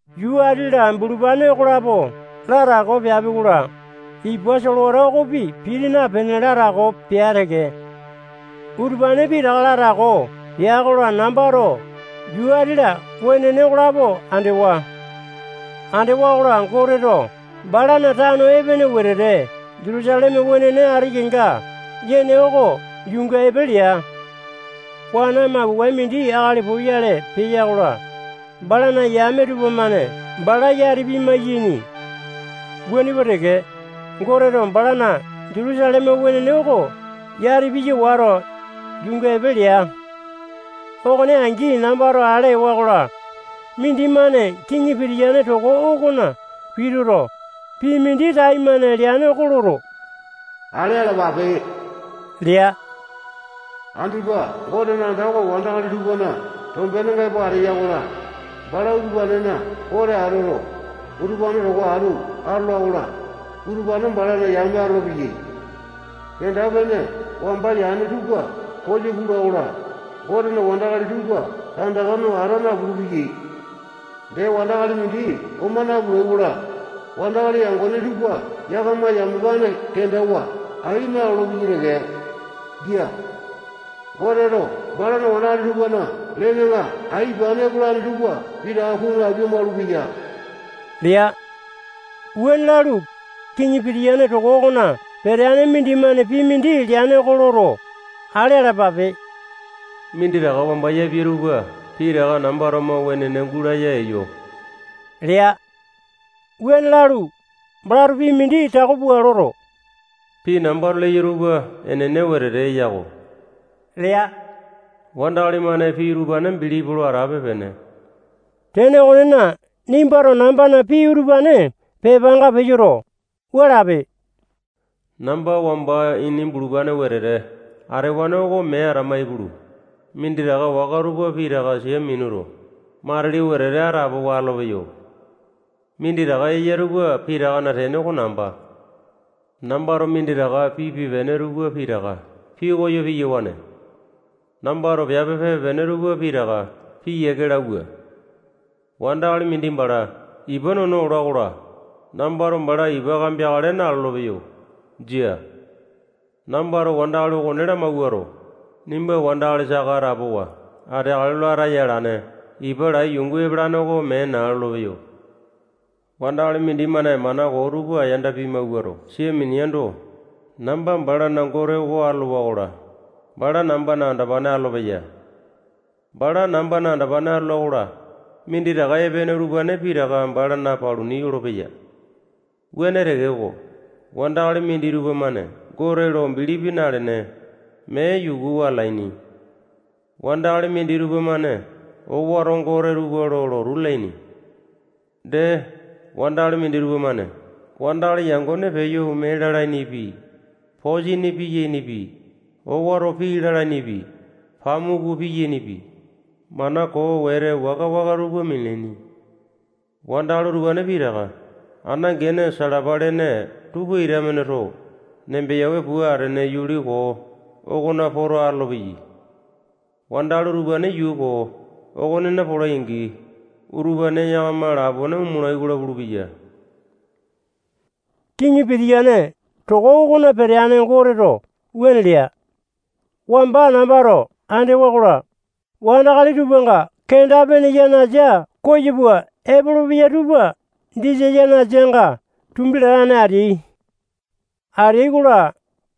Yuu ati-la bulupane okolapo latako peapi-kola, ipa solewata okopi piti napene, latako pea teke. Utupane pitaka latako peai-kola, nambato yuu ati-la wenene okolapo andewa. Andewa-kola, Goteto balana tano epene wetete Jutusaleme wenene ati kenga yane oko yuunga epe lea. Wana mapokae mindi akali poyale peya-kola, balana yame tupamane bala yati pimai-yaini. Wuane pua teke, Goteto balana Jutusaleme wenene oko yati piya wato, yuunga epe lea. Okone angi nambato ale ewa-kola, mindimane kiŋi pitiyane toko okona pituto, pii mindi taimane leane oko loto, ale alapape lea. Andipa Gotena anda oko wandakali tupana tombenenga epo ateya-kola, bala utupanena Gote atoto, utupane towa atu atola-kola, utupane balana yame atolopeyai. Kenda-pene wamba yane tupa koyo pula-kola, Gotena wandakali tupa tandaka no ata napulu-peyai. Dee, wandakali mindi oma napulai-kola, wandakali yangone tupa yakama yamapane kendawa ai nalolo-peyai teke. Jia. Goteto balana wandakali tupana lenenga ai ipane epolane tupa pitaka kunu apia-maulupeya lea. Wuane lalu, kiŋi pitiyane toko okona peteane mindimane pii mindi leane oko loto, ale alapape. Minditaka wamba yapia tupa pitaka nambato mo wenene gulaya eyo lea. Wuane lalu, balato pii mindi tako pua loto, pii nambato leyo tupa enene wetete eya-ko lea. Wandakali-mane pii utupane bilipi lo atape-pene. Tene okonena, nimbato nambana pii utupane pepanga peyoto, wua lape: Namba wamba ini bulupane wetete atewane oko mee atama ipulu, minditaka waka tupa pitaka sia minuto, matili wetete atapowa atolopeyo. Minditaka eya tupa pitakana tene oko namba. Nambato minditaka pipe-pene tupa pitaka pikoyo piyawane. Nambato piape pipe-pene tupa pitaka piyiake lauwa. Wandakali mindi bala ipa nono ola-kola, nambato bala ipa kambeakale nalolo-peyo. Jia. Nambato wandakali okone lamawuato, nimba wandakali saka atapowa ateakale lo ataya alane ipa lai yungu epalane oko mee naa lolopeyo. Wandakali mindimane mana koo tupa yanda pimawuato, sia mineando, namba balana Gote oko atolowa-kola, bala nambana andopane atolopeya. Bala nambana andopane atola-kola, minditaka epene utupane pitaka balana paluni yolopeya. Wuane tekeko, wandakali minditupa-mane Gote lo bilipi nalene, mee yukuwa atalaini. Wandakali minditupa-mane owato gote tupa lo lotu lalaini. Dee, wandakali minditupa-mane wandakali yangone peyo ome lalainipi, posini piyainipi, owato pii lalainipi, pamuku piyainipi, mana koo wete waka-waka tupa minalaini. Wandakali utupane pitaka ana gene salapa lene tupa ita-mane too nembeyawe pua atene yuli koo okona poto atolopeyai. Wandakali utupane yuu koo okonena polai-angi, utupane yakama lapone omolai-kola pulupeya. Kiŋi pitiyane toko okona peteane Goteto wuane lea. Wamba nambato andewa-kola, wandakali kenda-pene yanasa koyo pua epolopeya tupa disa yanasanga tumbi latane ateai. Ateai-kola,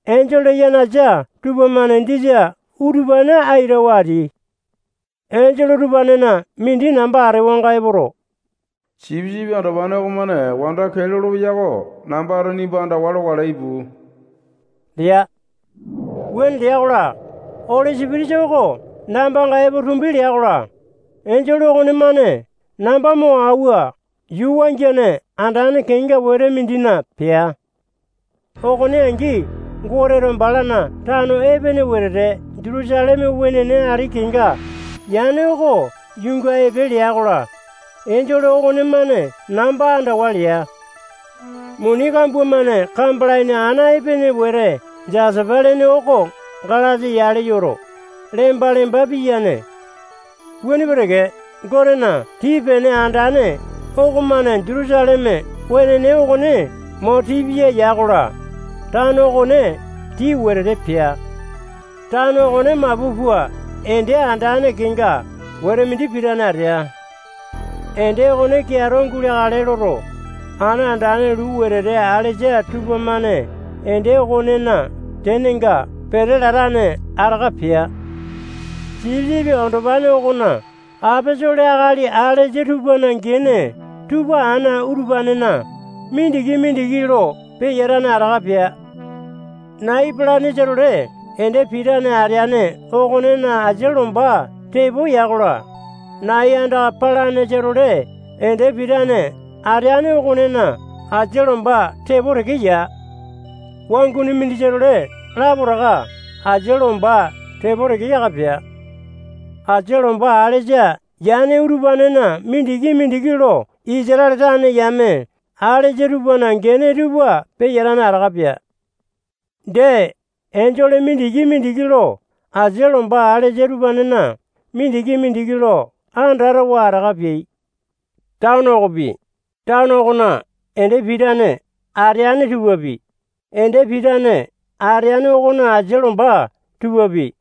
enjole yanasa tupamane disa utupane aitawa ateai. Enjole utupanena mindi namba atewanga epoto, Sipisipi Andopane okomane wanda kee lolopeya oko nambato nimba andawa lokale, ipu lea. Wuane lea-kola, Oli Sipitisa oko nambanga epo tumbi lea-kola, enjole okonemane namba mo auwa yuu wangiane andane kenga wete mindina pea. Okone angi, Goteto balana tano epene wetete Jutusaleme wenene ati kenga yane oko yuunga epe lea-kola, enjole okonemane namba andawa lea. Muni kambua-mane kambalaini ana epene wete Jasapa lene oko galasa yale yoto, lemba-lemba piyane. Wuane pua teke, Gotena tii-pene andane okomane Jutusaleme wenene okone mo tii piya ya-kola, tano okone tii wetete pea. Tano okone mapu pua ende andane kenga wete mindi pitane atea. Ende okone keato guleakale loto, ana andane luu wetete alesa tupamane ende okonena tenenga pete latane ataka pea. Sipisipi Andopane okona aposolo akali alesa tupana gene tupa ana utupanena mindiki-mindiki lo peyatane ataka pea. Nai epalanesa-tole ende pitane ateane okonena asia lomba tepo ya-kola, nai andaka palanesa-tole ende pitane ateane okonena asia lomba tepo teke ya. Wanguni mindisa-tole lapotaka asia lomba tepo teke yaka pea. Asia lomba alesa yane utupanena mindiki-mindiki lo Isatale tane yame alesa tupana gene tupa peyatane ataka pea. Dee, enjole mindiki-mindiki lo asia lomba alesa utupanena mindiki-mindiki lo andatawa ataka peai. Tano okopi, tano okona ende pitane ateane tupapi, ende pitane ateane okona asia lomba tupapi,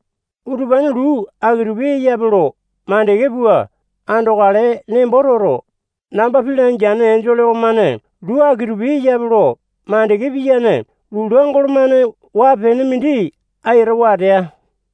utupane luu aki-tupi eyape lo mandeke pua andokale nembo toto, namba pii langeane enjole okonemane luu aki-tupi eyape lo makande piyane lula golo-mane waa-pene mindi aitawa atea.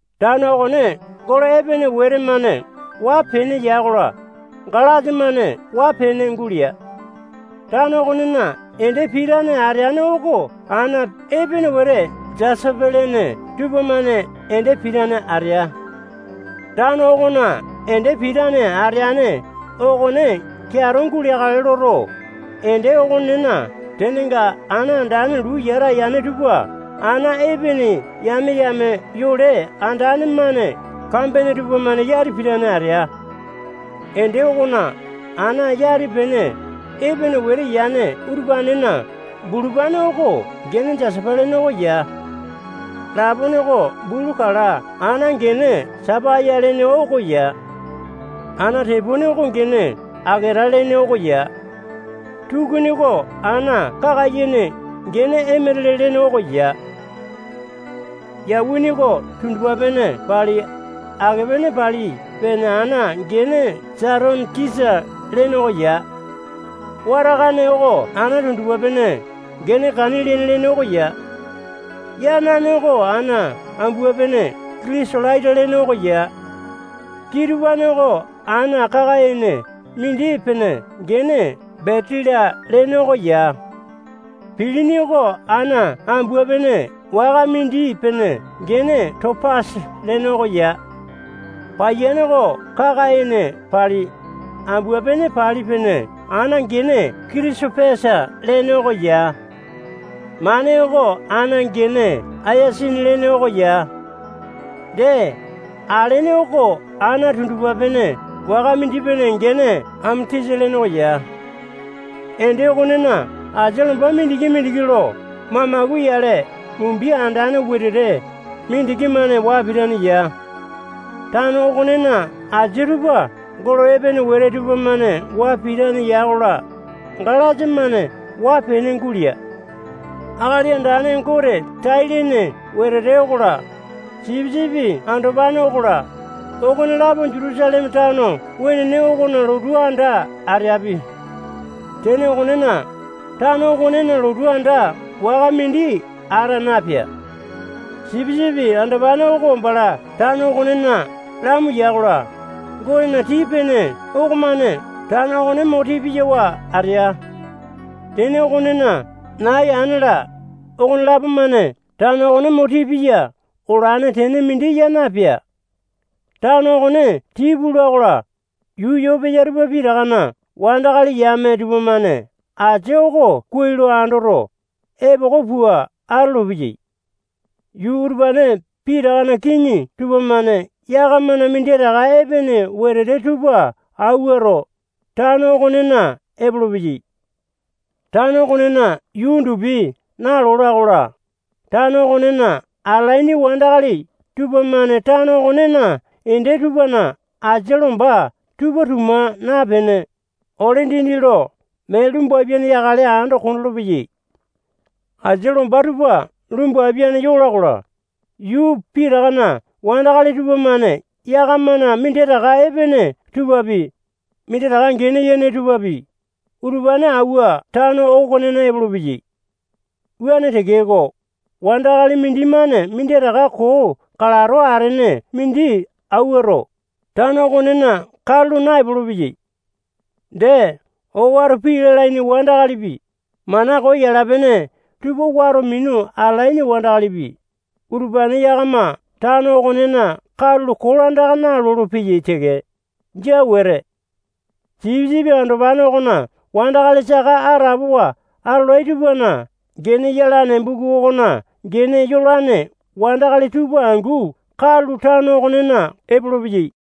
Tano okone golo epene wete-mane waa-pene ya-kola, galasa-mane waa-pene gulea. Tano okonena ende pitane ateane oko ana epene wete jasapa lene tupamane ende pitane atea. Tano okona ende pitane ateane okone keato guleakale loto, ende okonena tenenga ana andane luu yata yane tupa ana epene yame-yame yole andane-mane kambene tupamane yati pitane atea. Ende okona ana yati-pene epene wete yane utupanena bulupane oko gene jasapa lene oko ya. Lapone oko bulu kala ana gene sapaya lene oko ya. Ana tepone oko gene aketa lene oko ya. Tukuni oko ana kaka-ene gene emetele lene oko ya. Yawini oko tundupa-pene pali, ake-pene pali pene ana gene satonikisa lene oko ya. Watakane oko ana tundupa-pene gene kaniliane lene oko ya. Yanane oko ana ambua-pene kitisolaita lene oko ya. Kitupane oko ana kaka-ene mindi-pene gene betila lene oko ya. Pilini oko ana ambua-pene waka mindi-pene gene topasa lene oko ya. Paiyane oko kaka-ene pali, ambua-pene pali pene ana gene kitisopesa lene oko ya. Mane oko ana gene ayasini lene oko ya. Dee, alene oko ana tundupa-pene waka mindi-pene gene ametisa lene oko ya. Ende okonena asia lomba mindiki-mindiki lo mamaku yale mumbi andane wetete mindiki-mane waa pitane ya. Tano okonena asini tupa golo epene wete tupamane waa pitane ya-kola, galasa-mane waa-pene gulea. Akali Andane Gote tai-lene wetete okola, Sipisipi Andopane okola, okonelapo Jutusaleme tano wenene okona lotu anda ateapi. Tene okonena, tano okonena lotu anda waka mindi ata napea. Sipisipi Andopane oko bala tano okonena lamu ya-kola, Gotena tii-pene okomane tano okone mo tii piyawa atea. Tene okonena, nai ana-la, okonelapo-mane tano okone mo tii piya olane tene mindi ya napea. Tano okone tii pula-kola, yuu yo peya tupa pitakana wandakali yame tupamane asia oko kuai lo andoto, epoko pua atolopeyai. Yuu utupane pitakana kiŋi tupamane yakamana minditaka epene wetete tupa awuato, tano okonena epolopeyai. Tano okonena yuu undupi nalola-kola, tano okonena atalaini wandakali tupamane tano okonena ende tupana asia lomba tupa tuma napene, ole dindi lo mee lumbapiane yakale lo ando kondolo-peyai. Asia lomba tupa lumbapiane yai-kola, yuu pitakana wandakali tupamane yakamana minditaka epene tupapi, minditaka gene yene tupapi, utupane auwa tano okonena epolopeyai. Wuane tekeko, wandakali mindimane minditaka koo kalato atene mindi auwato, tano okonena katulo naepolo-peyai. Dee, owato pii lalaini wandakalipi, mana koo yala-pene tupa wato minu atalaini wandakalipi, utupane yakama tano okonena katulo kolandaka nalolo-peyai teke. Jia wete. Sipisipi Andopane okona wandakali saka atapowa atolai tupana gene yalane buku okona gene yolane wandakali tupa angu katulo tano okonena epolopeyai.